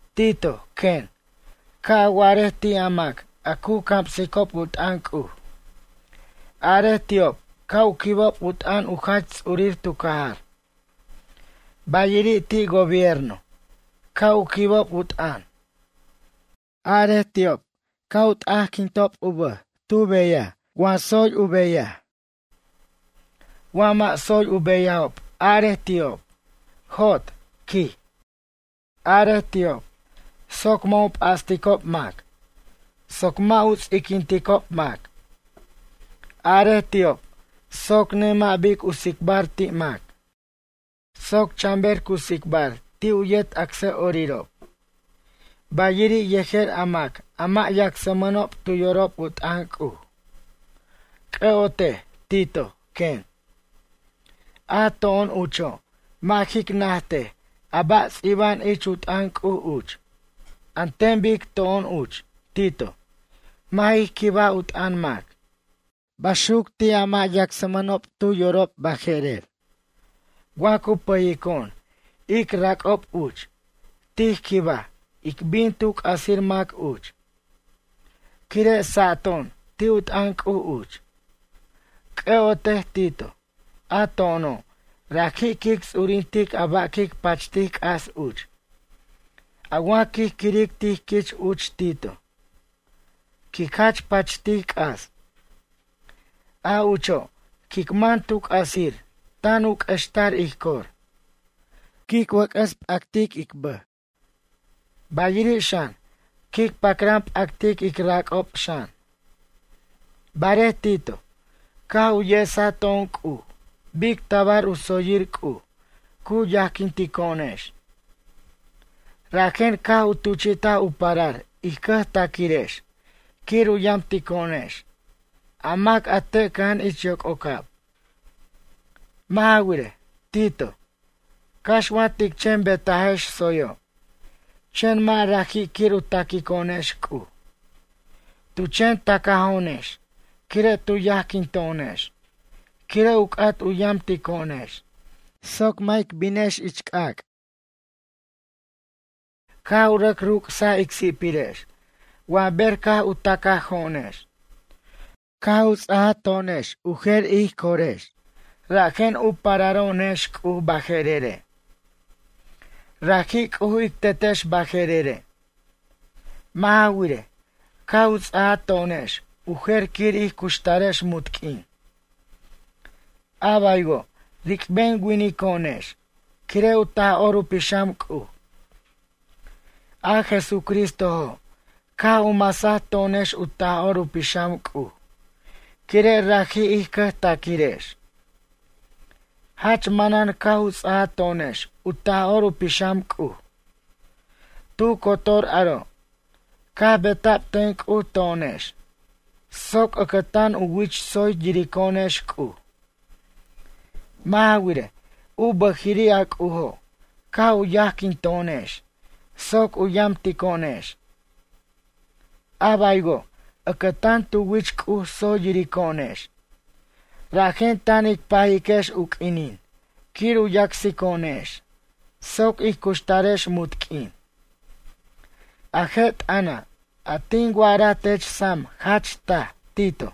Tito, quen, ca' a wa'arej ti' a mac a cu camsicob u t'ʌn C'uj. Arej ti'ob ca' u quibob u t'ʌn u jach ts'urir tu cajar. Bayiri' ti' gobierno, ca' u quibob u t'ʌn. Arej ti'ob ca' u t'ajquintob u bʌj tu beyaj wa tsoy u beyaj. Wa mʌ' tsoy u beyajob arej ti'ob: “Jot”, quij. Arej ti'ob, soc mʌ' u p'asticob mac, soc mʌ' u ts'iquinticob mac. Arej ti'ob soc nemʌ' bic u tsicbar ti' mac, soc chan ber cu tsicbar ti' u yet acsʌ'orirob. Bayiri' yejer a mac a mʌ' yacsmʌnob tu yorob u t'ʌn C'uj. C'ʌ'otej, Tito, quen. A to'on ucho' mʌ' jic najtej a ba' ts'iba'an ich u t'ʌn C'uj uch. An ten bic to'on uch, Tito, mʌ' jij quibaj u t'ʌn mac. Baxuc ti' a mʌ' yacsmanob tu yorob baje'rer. Wa cu pʌyico'on ic rac'ob uch, tij quibaj ic bin tu c'asir mac uch. Quire' sato'on ti' u t'ʌn C'uj uch. C'ʌ'otej, Tito, a to'ono' raji' quic ts'urintic a ba' quic pachtic c'as uch. A wa quij quiric tij quich uch Tito. Quic jach pachtic c'as. A ucho' quic man tu c'asir tan u q'uextar ij cor. Quic wʌc'ʌs p'actic ic bʌj. Bayiri' xan quic pacran p'actic ic rac'ob xan. Barej Tito, caj u yesa to'on C'uj bic tabar u tsoyir C'uj cu yajquintico'onex. Rajen caj u tuchi'taj u parar ij cʌjtaquirex quir u yamtico'onex, a mac a te' cʌja'an ich yoc'ocab. Mʌ' ja wirej, Tito, cax wa tic chen betajex tsoyo', chen mʌ' raji' quir u taquico'onex C'uj. Tu chen tacajo'onex quire' tu yajquinto'onex quire' u c'at u yamtico'onex soc mʌ' ic binex c'ac'. Caj u rʌc ruc'sa ic si'pirex wa ber caj u tacajo'onex. Caj u ts'aj to'onex u jer ij corex rajen u pararo'onex C'uj baje'rere'. Raji' C'uj ic Tetex baje'rere'. Mʌ' ja wirej, caj u ts'aja to'onex u jer quir ij cuxtarex munt q'uin. A baywo' ric'ben winico'onex quire' u Taj'or u Pixam C'uj. A Jesucristojo' caj u masaj to'onex u Taj'or u Pixam C'uj quire' raji' ij cʌjtaquirex. Jach manan caj u ts'aja to'onex u Taj'or u Pixam C'uj. Tu cotor aro', caj beta'b ten C'uj to'onex soc ʌcʌtan u wich tsoy yirico'onex C'uj. Mʌ' ja wirej, u bʌjiri' a C'ujo' caj u yajquinto'onex soc u yamtico'onex. A baywo', ʌcʌtan tu wich C'uj tsoy yirico'onex. Rajen tan ic pajiquex u q'uinin quir u yacsico'onex soc ic cuxtarex munt q'uin. A je' t'ʌna', a tin wa'ara tech sam jach taj, Tito.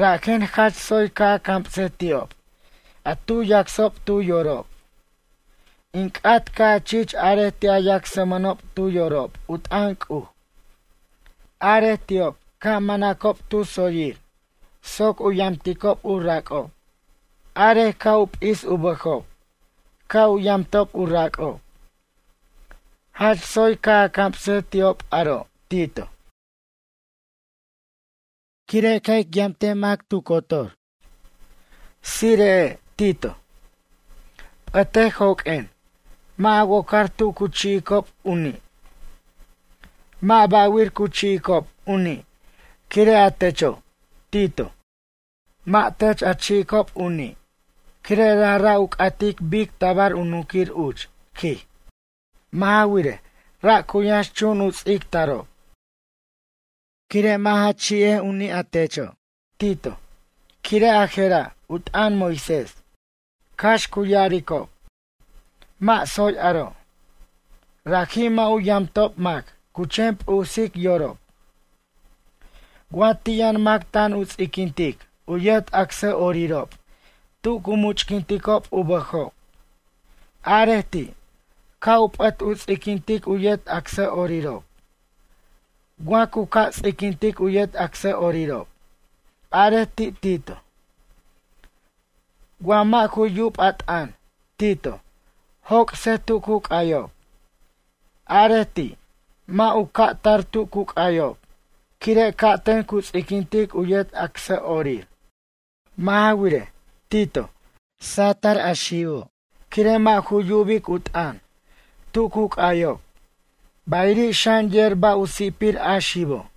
Rajen jach tsoy ca' a camsej ti'ob a tu yacsob tu yorob. In c'at ca' a chich arej ti' a yacsmʌnob tu yorob u t'ʌn C'uj. Arej ti'ob ca' manacob tu tsoyir soc u yamticob u rac'ob. Arej ca' u p'is u bʌjob ca' u yamtob u rac'ob. Jach tsoy ca' a camsej ti'ob aro', Tito. Quire' ca' ic yamtic mac tu cotor. Tsire'e' Tito. P'ʌtej joq'uen mʌ' a wocar tu cu chi'icob u ni'. Mʌ' ba'wir cu chi'icob u ni' quire' a techo', Tito, mʌ' tech a chi'icob u ni' quire' rajra' u c'atic bic tabar u nunquir uch, quij. Mʌ' ja wirej, ra' cu yʌnx chun u ts'ictacob. Quire' mʌ' ja chi'ibar u ni', a techo', Tito, quire' a je'ra' u t'ʌn Moisés. Cax cu ya'aricob: “Mʌ' tsoy aro'.” Raji' mʌ' u yamtob mac cu chen p'usic yorob. Wa ti' yʌn mac tan u ts'iquintic u yet acsʌ'orirob tu cu much'quinticob u bʌjob. Arej ti', ca' u p'ʌt u ts'iquintic u yet acsʌ'orirob. Wa cu ca' ts'iquintic u yet acsʌ'orirob. Arej ti', Tito, wa mʌ' ju yub a t'ʌn, Tito, joc'sej tu cu c'ayob. Arej ti', mʌ' u ca' tar tu cu c'ayob quire' ca'ten cu ts'iquintic u yet acsʌ'orir. Mʌ' ja wirej, Tito, sa'tʌr a xibo' quire' mʌ' ju yubic u t'ʌn, tu cu c'ayob, bayiri' xan yer ba' u si'pir a xibo'.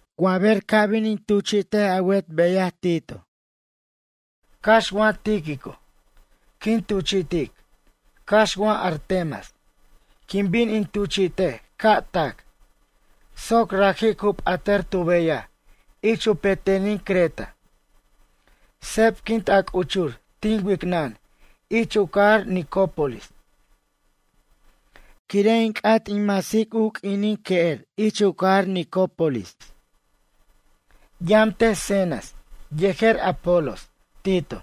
Wa ber ca' bin in tuchi't a wet beyaj, Tito. Cax wa Tíquico, quin tuchi'tic cax wa Artemas, quin bin in tuchi'tej ca' tac. Soc raji' cu p'atar tu beyaj ich u petenin Creta. Sebquint a c'uchur tin wicnʌn ich u cajar Nicópolis, quire' in c'at in mas u q'uinin que'er ich u cajar Nicópolis. Yamtej Zenas yejer Apolos, Tito.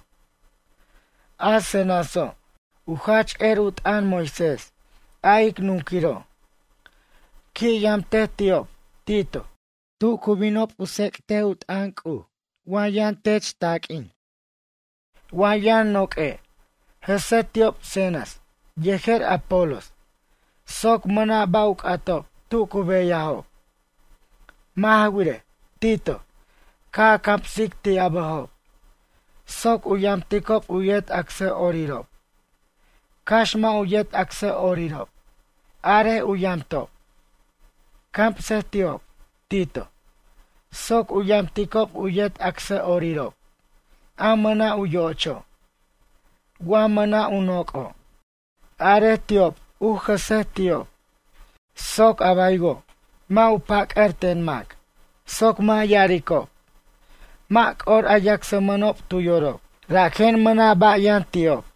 A Zenaso', u jach er u t'ʌn Moisés, a ic nunquiro'. Qui' yamtej ti'ob, Tito, tu cu binob u tsec't u t'ʌn C'uj wa yʌn tech taq'uin. Wa yʌn noq'ue', jʌse ti'ob Zenas yejer Apolos, soc mʌna' ba' u c'atob tu cu beyajob. Mʌ' ja wirej, Tito, ca' a camsic ti' a bʌjob, soc u yamticob u yet acsʌ'orirob. Cax mʌ' u yet acsʌ'orirob, arej u yamtob. Camsej ti'ob, Tito, soc u yamticob u yet acsʌ'orirob a mʌna' u yo'ocho'. Wa mʌna' u noc'o', arej ti'ob u jʌsej ti'ob. Soc a baywo', mʌ' u pac'ar ten mac, soc mʌ' ya'aricob: “Mʌ' c'or a yacsmʌnob tu yorob, rajen mʌna' ba' yʌn ti'ob.”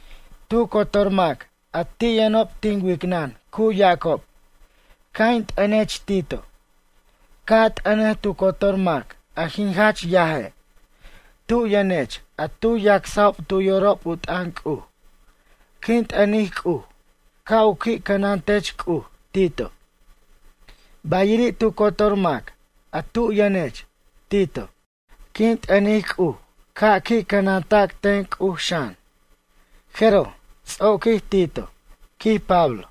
Tu cotor mac a ti' yʌnob tin wicnʌn cu yacob, ca' in t'ʌnech Tito. Ca' a t'ʌnej tu cotor mac a jin jach yaje', tub yʌnech a tu yacsajob tu yorob u t'ʌn C'uj. Quin t'ʌnic C'uj ca' u qui' cʌnantech C'uj, Tito. Bayiri' tu cotor mac a tu yʌnech, Tito. Quin t'ʌnic C'uj ca' qui' cʌnanta' ten C'uj, xan. Jeroj ts'oquij Tito, quij Pablo.